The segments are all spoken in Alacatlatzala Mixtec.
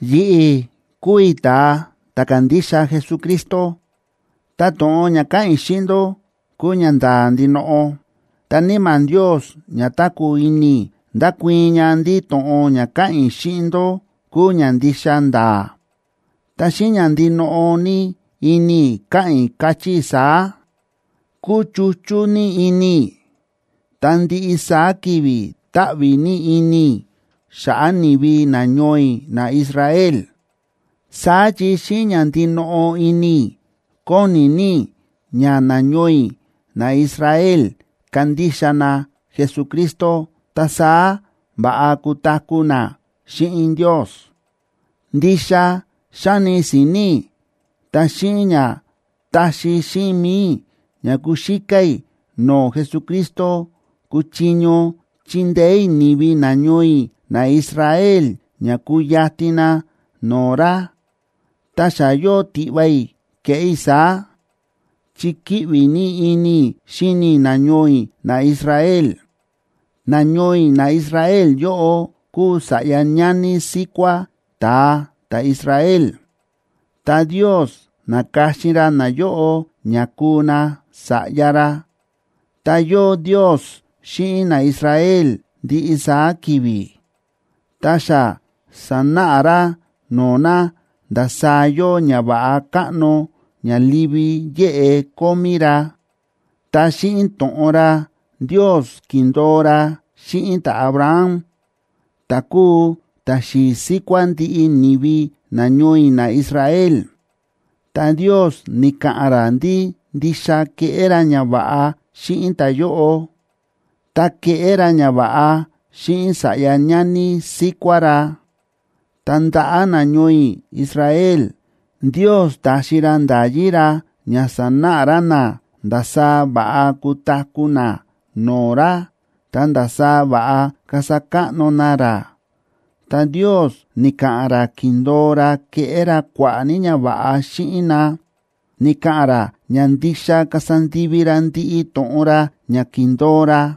Yi̱ꞌi̱ kúu i̱ ta̱a ta̱ kándixa Jesucristo, ta to̱ꞌon ña káꞌa̱n i̱ xíꞌin ndó kúu ñanda̱a̱ ndinoꞌo. Ta Níma̱ Ndios ña táku̱ ini i̱, ndákuii̱n ña ndí to̱ꞌon ña káꞌa̱n i̱ xíꞌin ndó kúu ña ndixa nda̱a̱, ta xíꞌin ña ndinoꞌo ní ini i̱ káꞌa̱n i̱, káchí i̱ saá: Kúchuchú ní ini i̱, ta ndiꞌi saá ki̱vi̱ táꞌví ní ini i̱ xa̱ꞌa̱ ni̱vi nañoo i̱ naIsrael. Saá chi xíꞌin ña ndinoꞌo ini i̱ kóni ní i̱ ña nañoo i̱ naIsrael kandixa na Jesucristo, ta saá va̱ꞌa kutaku̱ na xíꞌin Ndios. Ndixa xáni si̱ni̱ i̱ tá xíꞌin ña taxi xíꞌin mi̱i i̱ ña kuxíká i̱ no̱o̱ Jesucristo kuchiño chindeé i̱ ni̱vi nañoo i̱ naIsrael ña kuyatin na no̱o̱ ra, ta xa yóo tiꞌva i̱ keꞌé i̱ saá, chi kíꞌvi ní ini i̱ xíni i̱ nañoo i̱ naIsrael. Nañoo i̱ naIsrael yóꞌo kúu sa̱ꞌya ñani síkuá ta̱a ta̱Israel,a ta Ndios na̱ka̱xin ra nayóꞌo ña kuu na sa̱ꞌya ra. Ta yóo Ndios xíꞌin naIsrael ndiꞌi saá ki̱vi̱, ta xa sa̱náꞌa ra no̱o̱ na ndasaá yóo ñava̱ꞌa káꞌno ña livi yéꞌe kómí ra. Ta xíꞌin to̱ꞌon ra, Ndios ki̱ndo̱o ra xíꞌin ta̱Abraham, ta̱ kúu ta̱xi̱i̱ síkuá ndiꞌi ni̱vi nañoo i̱ naIsrael, ta Ndios ni̱ka̱ꞌa̱n ra ndí ndixa keꞌé ra ñava̱ꞌa xíꞌin ta̱yóꞌo, ta keꞌé ra ñava̱ꞌa xíꞌin sa̱ꞌya ñani síkuá ra. Ta ndaꞌa̱ nañoo i̱ Israel, Ndios ta̱xi ra nda̱yí ra ña sánáꞌa ra na ndasaá va̱ꞌa kutaku̱ na no̱o̱ ra, ta ndasaá va̱ꞌa kasa káꞌno na ra. Ta Ndios ni̱ka̱ꞌa̱n ra ki̱ndo̱o ra keꞌé ra kua̱ꞌa̱ ní ñava̱ꞌa xíꞌin na, ni̱ka̱ꞌa̱n ra ña ndixa kasa ndivi ra ndiꞌi to̱ꞌon ra ña ki̱ndo̱o ra.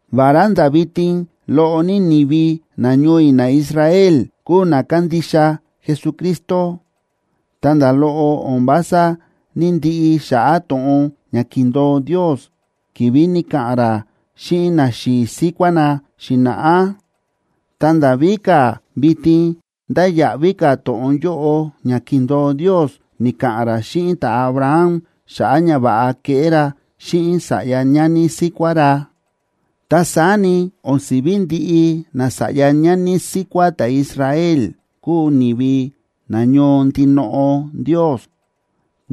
Vará nda̱ vitin loꞌo ní ni̱vi nañoo i̱ naIsrael kúu na kándixa Jesucristo, ta nda̱ loꞌo o̱n vása ní‑ndiꞌi xa̱ꞌa̱ to̱ꞌon ña ki̱ndo̱o Ndios ki̱vi̱ ni̱ka̱ꞌa̱n ra xíꞌin naxi̱i̱ síkuá na xi̱na̱ꞌá. Ta nda̱ víka̱, vitin ndáya̱ꞌví ka̱ to̱ꞌon yóꞌo ña ki̱ndo̱o Ndios ni̱ka̱ꞌa̱n ra xíꞌin ta̱Abraham xa̱ꞌa̱ ñava̱ꞌa keꞌé ra xíꞌin sa̱ꞌya ñani síkuá ra. Ta saá ni, o̱n si̱ví ndiꞌi nasa̱ꞌya ñani síkuá ta̱Israel kúu ni̱vi nañoo ndinoꞌo Ndios.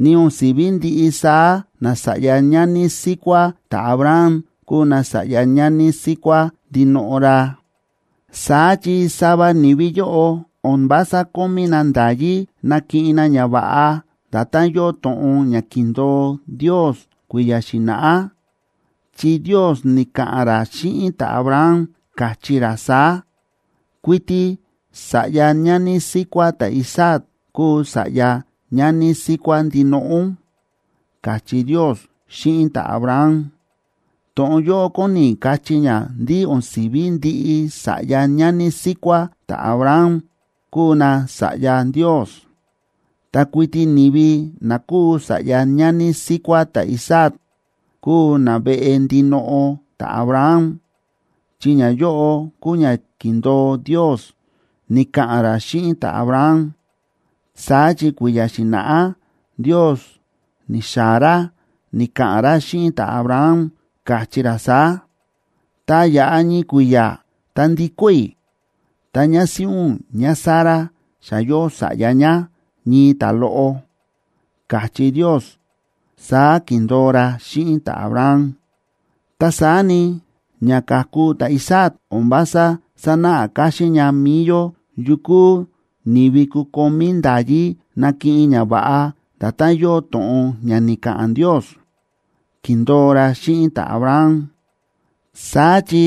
Ni o̱n si̱ví ndiꞌi saá nasa̱ꞌya ñani síkuá ta̱Abraham kúu nasa̱ꞌya ñani síkuá ndinoꞌo ra. Saá chi sava ni̱vi yóꞌo o̱n vása kómí na nda̱yí nakiꞌin na ñava̱ꞌa nda̱tán yóo to̱ꞌon ña ki̱ndo̱o Ndios kui̱ya̱ xi̱na̱ꞌá, chi Ndios ni̱ka̱ꞌa̱n ra xíꞌin ta̱Abraham, káchí ra saá: “Kuiti sa̱ꞌya ñani síkuá ta̱Isaac kuu sa̱ꞌya ñani síkuá ndinoꞌo ún”, káchí Ndios xíꞌin ta̱Abraham. To̱ꞌon yóꞌo kóni kachí ña ndí o̱n si̱ví ndiꞌi sa̱ꞌya ñani síkuá ta̱Abraham kuu nasa̱ꞌya Ndios. Ta kuiti ni̱vi na kúu sa̱ꞌya ñani síkuá ta̱Isaac kúu naveꞌe ndinoꞌo ta̱Abraham, chi ñayóꞌo kúu ña ki̱ndo̱o Ndios, ni̱ka̱ꞌa̱n ra xíꞌin ta̱Abraham. Saá chi kui̱ya̱ xi̱na̱ꞌá Ndios ni̱xaa̱ ra ni̱ka̱ꞌa̱n ra xíꞌin ta̱Abraham, káchí ra saá: “Tá yaꞌa ñii kui̱ya̱, ta ndikó i̱, ta ñásíꞌí ún ñáSara xa yóo sa̱ꞌya ñá, ñii ta̱loꞌo”, káchí Ndios, saá ki̱ndo̱o ra xíꞌin ta̱Abraham. Ta saá ni, ña ka̱ku ta̱Isaac o̱n vása sánáꞌa káxín ña mi̱i yó yukú ni̱vi kukomí nda̱yí nakiꞌin ñava̱ꞌa nda̱tán yóo to̱ꞌon ña ni̱ka̱ꞌa̱n Ndios, ki̱ndo̱o ra xíꞌin ta̱Abraham. Saá chi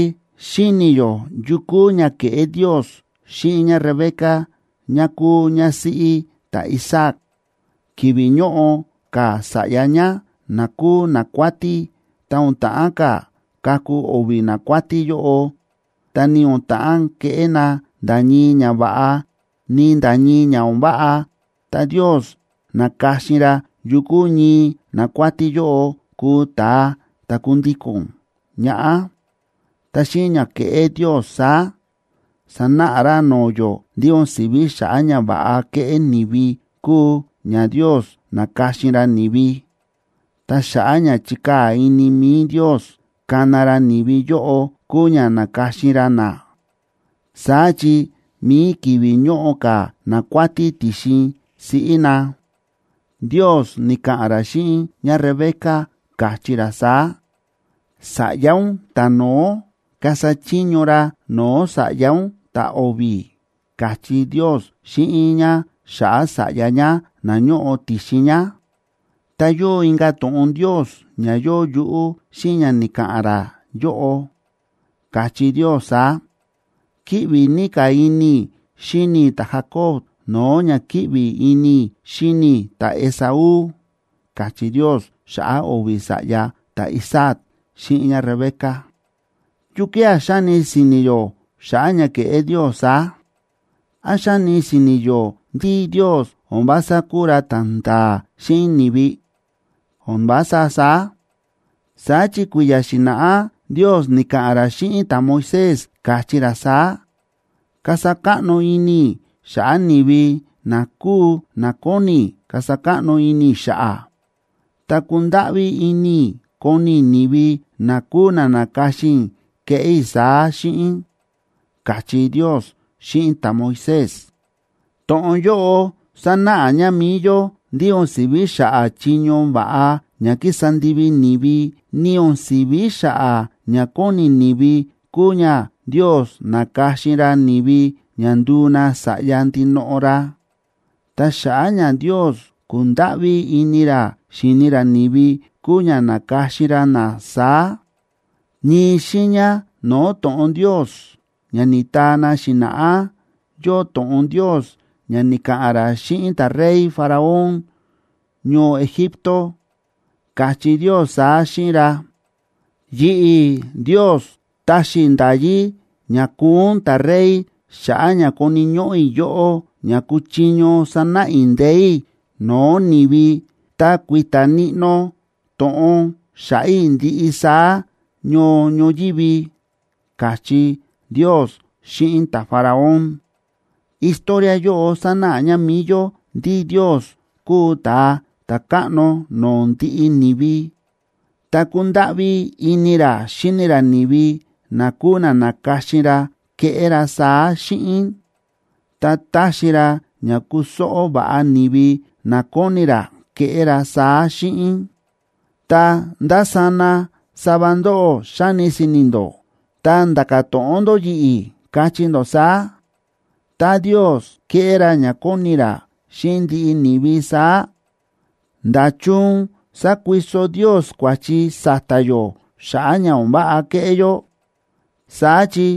xíni̱ yó yu kúu ña ke̱ꞌé Ndios xíꞌin ñáRebeca, ñá kuu ñásíꞌí ta̱Isaac. Ki̱vi̱ ñóꞌo ka̱ sa̱ꞌya ñá, na kúu nakuátí, ta o̱n ta̱ꞌán ka̱ kaku o̱vi̱ nakuátí yóꞌo, ta ni o̱n ta̱ꞌán keꞌé na nda̱ ñii ñava̱ꞌa, ni nda̱ ñii ña o̱n váꞌa, ta Ndios na̱ka̱xin ra yukú ñii nakuátí yóꞌo kuu ta̱a ta̱ kundíko̱n ñaꞌá. Ta xíꞌin ña ke̱ꞌé Ndios saá, sa̱náꞌa ra no̱o̱ yó ndí o̱n si̱ví xa̱ꞌa̱ ñava̱ꞌa kéꞌé ni̱vi kúu ña Ndios náka̱xin ra ni̱vi, ta xa̱ꞌa̱ ña chi̱kaa̱ ini mi̱i Ndios kana ra ni̱vi yóꞌo kúu ña náka̱xin ra na. Saá chi mi̱i ki̱vi̱ ñóꞌo ka̱ nakuátí ti̱xin siꞌí na, Ndios ni̱ka̱ꞌa̱n ra xíꞌin ñáRebeca, káchí ra saá: “Sa̱ꞌya ún ta̱no̱ó kasa chiño ra no̱o̱ sa̱ꞌya ún ta̱o̱vi̱”, káchí Ndios xíꞌin ñá xa̱ꞌa̱ sa̱ꞌya ñá na ñóꞌo ti̱xin ñá. Ta yóo inka̱ to̱ꞌon Ndios ña yóo yuꞌú xíꞌin ña ni̱ka̱ꞌa̱n ra yóꞌo, káchí Ndios saá: “Kíꞌvi ní ka̱ ini i̱ xíni i̱ ta̱Jacob, no̱o̱ ña kíꞌvi ini i̱ xíni i̱ ta̱Esaú”, káchí Ndios xa̱ꞌa̱ o̱vi̱ sa̱ꞌya ta̱Isaac xíꞌin ñáRebeca. ¿Yukía̱ xáni si̱ni̱ yó xa̱ꞌa̱ ña ke̱ꞌé Ndios saá? ¿Án xáni si̱ni̱ yó ndí Ndios o̱n vása kúu ra ta̱nda̱a̱ xíꞌin ni̱vi? ¡O̱n vása saá! Saá chi kui̱ya̱ xi̱na̱ꞌá Ndios ni̱ka̱ꞌa̱n ra xíꞌin ta̱Moisés, káchí ra saá: “Kasa káꞌno ini i̱ xa̱ꞌa̱ ni̱vi na kúu na kóni i̱ kasa káꞌno ini i̱ xa̱ꞌa̱, ta kundáꞌví ini i̱ koni i̱ ni̱vi, na kúu na na̱ka̱xin i̱ keꞌé i̱ saá xíꞌin”, káchí Ndios xíꞌin ta̱Moisés. To̱ꞌon yóꞌo sánáꞌa ña mi̱i yó ndí o̱n si̱ví xa̱ꞌa̱ chiño va̱ꞌa ña kísa ndivi ni̱vi, ni o̱n si̱ví xa̱ꞌa̱ ña kóni ni̱vi kúu ña Ndios náka̱xin ra ni̱vi ña nduu na sa̱ꞌya ndinoꞌo ra. Ta xa̱ꞌa̱ ña Ndios kúndáꞌví ini ra xíni ra ni̱vi, kúu ña náka̱xin ra na saá. Ñii xiiña no̱o̱ to̱ꞌon Ndios ña ni̱taa na xi̱na̱ꞌá, yóo to̱ꞌon Ndios ña ni̱ka̱ꞌa̱n ra xíꞌin ta̱rey Faraón ñoo Egipto, káchí Ndios saá xíꞌin ra: “Yi̱ꞌi̱, Ndios, ta̱xi i̱ nda̱yí ña kuu ún ta̱rey xa̱ꞌa̱ ña koni̱ ñóꞌó i̱ yóꞌó ña kuchiño sanáꞌa i̱ ndee̱ i̱ no̱o̱ ni̱vi ta kui̱ta̱ níꞌnó to̱ꞌon xa̱ꞌa̱ i̱ ndiꞌi saá ñoo ñoyívi”, káchí Ndios xíꞌin ta̱Faraón. Historia yóꞌo sánáꞌa ña mi̱i yó ndí Ndios kúu ta̱a ta̱káꞌno no̱o̱ ndiꞌi ni̱vi, ta kúndáꞌví ini ra xíni ra ni̱vi na kúu na na̱ka̱xin ra keꞌé ra saá xíꞌin. Ta táxi ra ña kusóꞌó va̱ꞌa ni̱vi na kóni ra keꞌé ra saá xíꞌin. Ta ndásana sava ndóꞌó xáni si̱ni̱ ndó, ta nda̱ka̱ to̱ꞌon ndó yi̱ꞌi̱, kachí ndó saá: “Tá Ndios kéꞌé ra ña kóni ra xíꞌin ndiꞌi ni̱vi saá, ¿nda̱chun sákuiso Ndios kua̱chi sa̱ta̱ yó xa̱ꞌa̱ ña o̱n váꞌa kéꞌé yó?, saá chi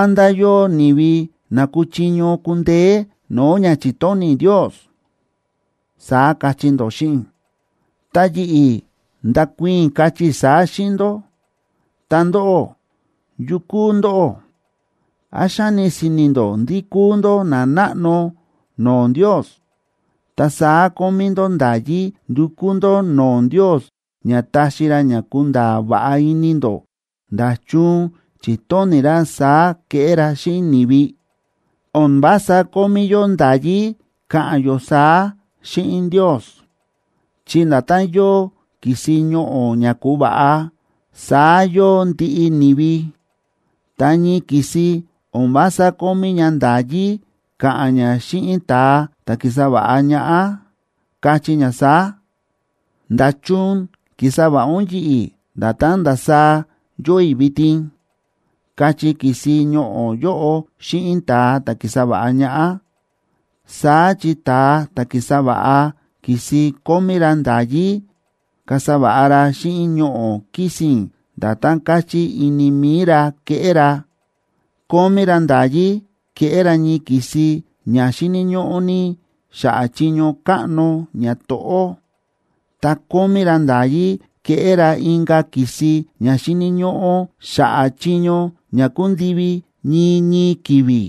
¿án ndá yóo ni̱vi na kuchiño kundeé no̱o̱ ña chi̱tóni̱ Ndios?”, saá kachí ndó xíꞌin i̱. Ta yi̱ꞌi̱ ndakuii̱n i̱, kachí i̱ saá xíꞌin ndó: Ta ndóꞌó, ¿yu kúu ndóꞌó? ¿Án xáni si̱ni̱ ndó ndí kúu ndó nanáꞌno no̱o̱ Ndios, ta saá kómí ndó nda̱yí ndukú ndó no̱o̱ Ndios ña taxi ra ña kunda̱a̱ va̱ꞌa ini ndó nda̱chun chi̱tóni̱ ra saá keꞌé ra xíꞌin ni̱vi? O̱n vása kómí yó nda̱yí ka̱ꞌa̱n yó saá xíꞌin Ndios, chi nda̱tán yóo ki̱si ñoꞌo̱ ña ku̱va̱ꞌa, saá yóo ndiꞌi ni̱vi. Ta ñii ki̱si o̱n vása kómí ña nda̱yí ka̱ꞌa̱n ña xíꞌin ta̱a ta̱ ki̱sa va̱ꞌa ñaꞌá, kachí ña saá: “¿Nda̱chun ki̱sa va̱ꞌa ún yi̱ꞌi̱ nda̱tán ndasaá yóo i̱ vitin?”, kachí ki̱si ñoꞌo̱ yóꞌo xíꞌin ta̱a ta̱ ki̱sa va̱ꞌa ñaꞌá. Saá chi ta̱a ta̱ ki̱sa va̱ꞌa ki̱si kómí ra nda̱yí kasa va̱ꞌa ra xíꞌin ñoꞌo̱ kisín nda̱tán káchí ini mi̱i ra keꞌé ra. Kómí ra nda̱yí keꞌé ra ñii ki̱si ña xíni̱ ñóꞌó ní xa̱ꞌa̱ chiño káꞌno ñato̱ꞌó, ta kómí ra nda̱yí keꞌé ra inka̱ ki̱si ña xíni̱ ñóꞌó xa̱ꞌa̱ chiño ña kundivi ñii ñii ki̱vi̱.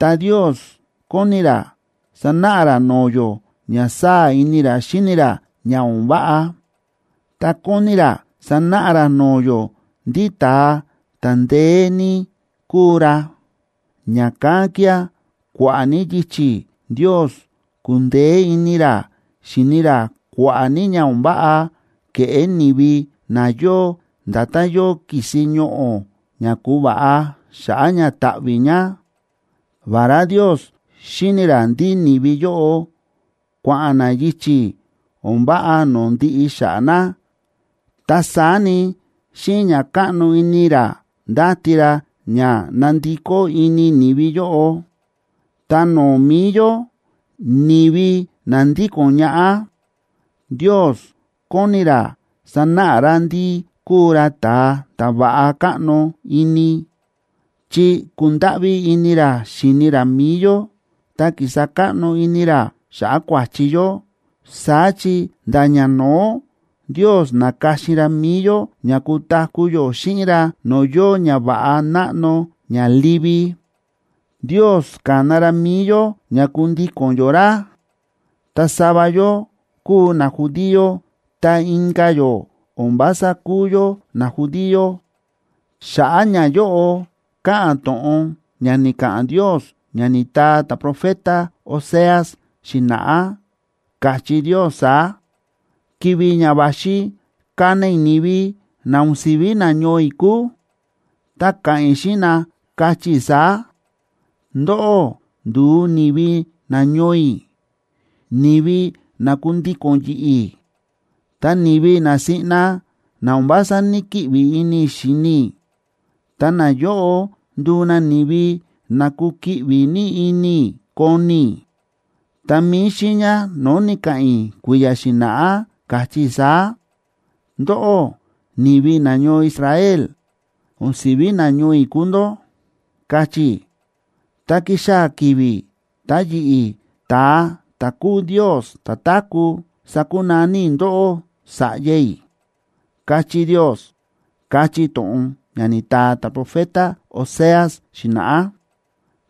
Ta Ndios kóni ra sanáꞌa ra no̱o̱ yó ña sáa̱ ini ra xíni ra ña o̱n váꞌa, ta kóni ra sanáꞌa ra no̱o̱ yó ndí ta̱a ta̱ ndeé ní kúu ra. Ña̱kán kía̱ kua̱ꞌa̱ ní yichi̱ Ndios kúndeé ini ra xíni ra kua̱ꞌa̱ ní ña o̱n váꞌa kéꞌé ni̱vi na yóo nda̱tán yóo ki̱si ñoꞌo̱ ña ku̱va̱ꞌa xa̱ꞌa̱ ña táꞌví ña. Vará Ndios xíni̱ ra ndí ni̱vi yóꞌo kua̱ꞌa̱n na yichi̱ o̱n váꞌa no̱o̱ ndiꞌi xa̱ꞌa̱ na, ta saá ni, xíꞌin ña káꞌno ini ra ndáti ra ña ná ndikó ini ni̱vi yóꞌo. Ta no̱o̱ mi̱i yó, ni̱vi na ndíko̱n ñaꞌá, Ndios kóni ra sanáꞌa ra ndí kúu ra ta̱a ta̱ va̱ꞌa káꞌno ini, chi ku̱ndáꞌví ini ra xi̱ni ra mi̱i yó ta ki̱sa káꞌno ini ra xa̱ꞌa̱ kua̱chi yó. Saá chi nda̱ ñano̱ó Ndios na̱ka̱xin ra mi̱i yó ña kutaku̱ yó xíꞌin ra no̱o̱ yóo ñava̱ꞌa náꞌno ña livi. Ndios ka̱na ra mi̱i yó ña kundíko̱n yó ra, ta sava yó kúu najudío ta inka̱ yó o̱n vása kúu yó najudío. Xa̱ꞌa̱ ñayóꞌo káꞌa̱n to̱ꞌon ña ni̱ka̱ꞌa̱n Ndios ña ni̱taa ta̱profeta Oseas xi̱na̱ꞌá, káchí Ndios saá: Ki̱vi̱ ña va̱xi kana i̱ ni̱vi na o̱n si̱ví nañoo i̱ kúu, ta ka̱ꞌa̱n i̱ xíꞌin na, kachí i̱ saá: “Ndóꞌó nduu ni̱vi nañoo i̱, ni̱vi na kundíko̱n yi̱ꞌi̱. Ta ni̱vi na siꞌna na o̱n vása ní‑kiꞌvi ini i̱ xíni i̱, ta nayóꞌo nduu na ni̱vi na kukiꞌvi ní ini i̱ koni i̱.” Ta mi̱i xiiña no̱o̱ ni̱ka̱ꞌa̱n i̱ kui̱ya̱ xi̱na̱ꞌá, káchí i̱ saá: “Ndóꞌó, ni̱vi nañoo Israel, o̱n si̱ví nañoo i̱ kúu ndó”, káchí i̱, “ta kixaa̱ ki̱vi̱ ta yi̱ꞌi̱, ta̱a ta̱ kúu Ndios ta̱táku̱, sakunaní i̱ ndóꞌó sa̱ꞌya i̱”, káchí Ndios, káchí to̱ꞌon ña ni̱taa ta̱profeta Oseas xi̱na̱ꞌá.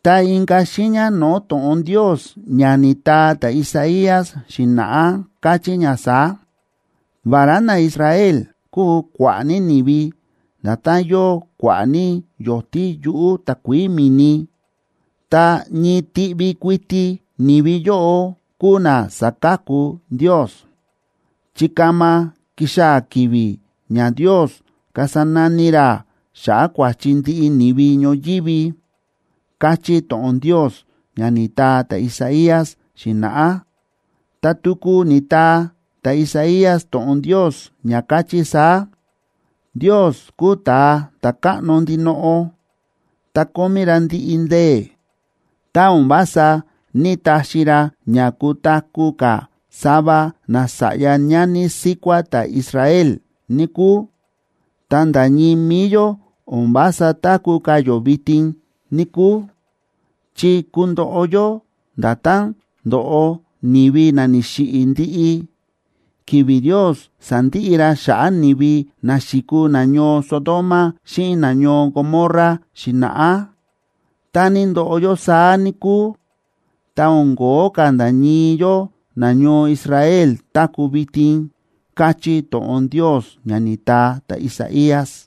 Ta inka̱ xiiña no̱o̱ to̱ꞌon Ndios ña ni̱taa ta̱Isaías xi̱na̱ꞌá, káchí ña saá: “Vará naIsrael kúu kua̱ꞌa̱ ní ni̱vi, nda̱tán yóo kua̱ꞌa̱ ní yo̱tí yuꞌu̱ takuií mi̱ni, ta ñii tiꞌvi kuiti ni̱vi yóꞌo kuu na saka̱ku Ndios. Chi kama kixaa̱ ki̱vi̱ ña Ndios kasa nani ra xa̱ꞌa̱ kua̱chi ndiꞌi ni̱vi ñoyívi”, káchí to̱ꞌon Ndios, ña ni̱taa ta̱Isaías xi̱na̱ꞌá. Ta tuku ni̱taa ta̱Isaías to̱ꞌon Ndios ña káchí saá: Ndios kúu ta̱a ta̱káꞌno ndinoꞌo, ta kómí ra ndiꞌi ndee̱. Tá o̱n vása ní‑taxi ra ña kutaku̱ ka̱ sava nasa̱ꞌya ñani síkuá ta̱Israel, níkúu, ta nda̱ ñii mi̱i yó o̱n vása táku̱ ka̱ yó vitin, níkúu, chi kundoꞌo yó nda̱tán ndo̱ꞌo ni̱vi na ni̱xiꞌi̱ ndiꞌi, ki̱vi̱ Ndios sa̱ndiꞌi ra xa̱ꞌa̱ ni̱vi na xi̱kuu nañoo Sodoma xíꞌin nañoo Gomorrab xi̱na̱ꞌá. Tá ni̱ndoꞌo yó saá, níkúu, ta o̱n kóo ka̱ nda̱ ñii yó nañoo Israel táku̱ vitin, káchí to̱ꞌon Ndios, ña ni̱taa ta̱Isaías.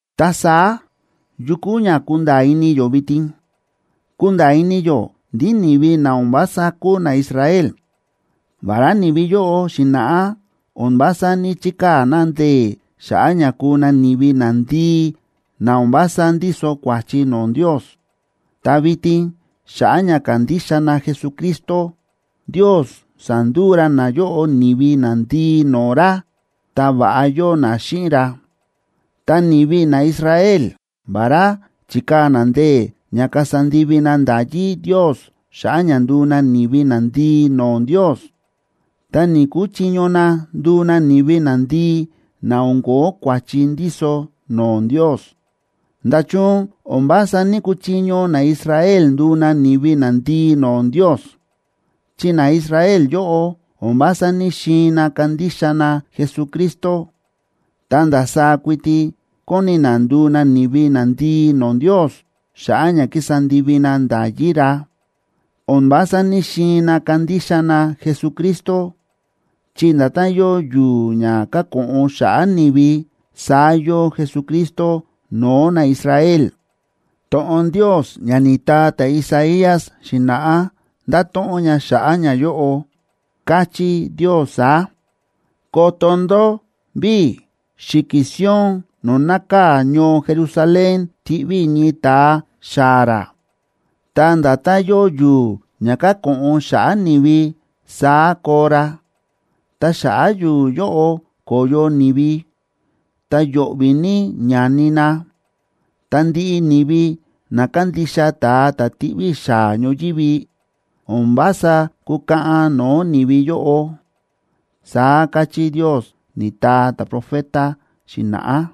Ta saá, ¿yu kúu ña kúnda̱a̱ ini yó vitin? Kúnda̱a̱ ini yó ndí ni̱vi na o̱n vása kúu naIsrael, vará ni̱vi yóꞌo xi̱na̱ꞌá o̱n vása ní‑chikaa̱ na ndee̱ xa̱ꞌa̱ ña kuu na ni̱vi nandii na o̱n vása ndíso kua̱chi no̱o̱ Ndios, ta vitin, xa̱ꞌa̱ ña kándixa na Jesucristo, Ndios sa̱nduu ra nayóꞌo ni̱vi nandii no̱o̱ ra, ta va̱ꞌa yóo na xíꞌin ra. Ta ni̱vi naIsrael, vará chi̱kaa̱ na ndee̱ ña kasa ndivi na nda̱yí Ndios xa̱ꞌa̱ ña nduu na ni̱vi nandii no̱o̱ Ndios, ta ni̱‑kuchiño na nduu na ni̱vi nandii na o̱n ko̱ó kua̱chi ndíso no̱o̱ Ndios. ¿Nda̱chun o̱n vása ní‑kuchiño naIsrael nduu na ni̱vi nandii no̱o̱ Ndios?, chi naIsrael yóꞌo, o̱n vása ní‑xiin na kandixa na Jesucristo, ta ndasaá kuiti kóni na nduu na ni̱vi nandii no̱o̱ Ndios xa̱ꞌa̱ ña ki̱sa ndivi na nda̱yí ra. O̱n vása ní‑xiin na kandixa na Jesucristo, chi nda̱tán yóo yu̱u̱ ña káko̱ꞌon xa̱ꞌa̱ ni̱vi, saá yóo Jesucristo no̱o̱ naIsrael. To̱ꞌon Ndios ña ni̱taa ta̱Isaías xi̱na̱ꞌá, nda̱to̱ꞌon ña xa̱ꞌa̱ ñayóꞌo. Káchí Ndios saá: Koto ndó ví, xi̱ki̱ Sion no̱o̱ nákaa̱ ñoo Jerusalén tiꞌví i̱ ñii ta̱a xaa̱ ra. Ta nda̱tán yóo yu̱u̱ ña káko̱ꞌon xa̱ꞌa̱ ni̱vi, saá koo ra, ta xa̱ꞌa̱ yu̱u̱ yóꞌo ko̱yo ni̱vi, ta yo̱ꞌvi̱ ní ñani na. Ta ndiꞌi ni̱vi na kandixa ta̱a ta̱ tiꞌví i̱ xaa̱ ñoyívi, o̱n vása kúkaꞌan no̱o̱ ni̱vi yóꞌo, saá káchí Ndios, ni̱taa ta̱profeta xi̱na̱ꞌá.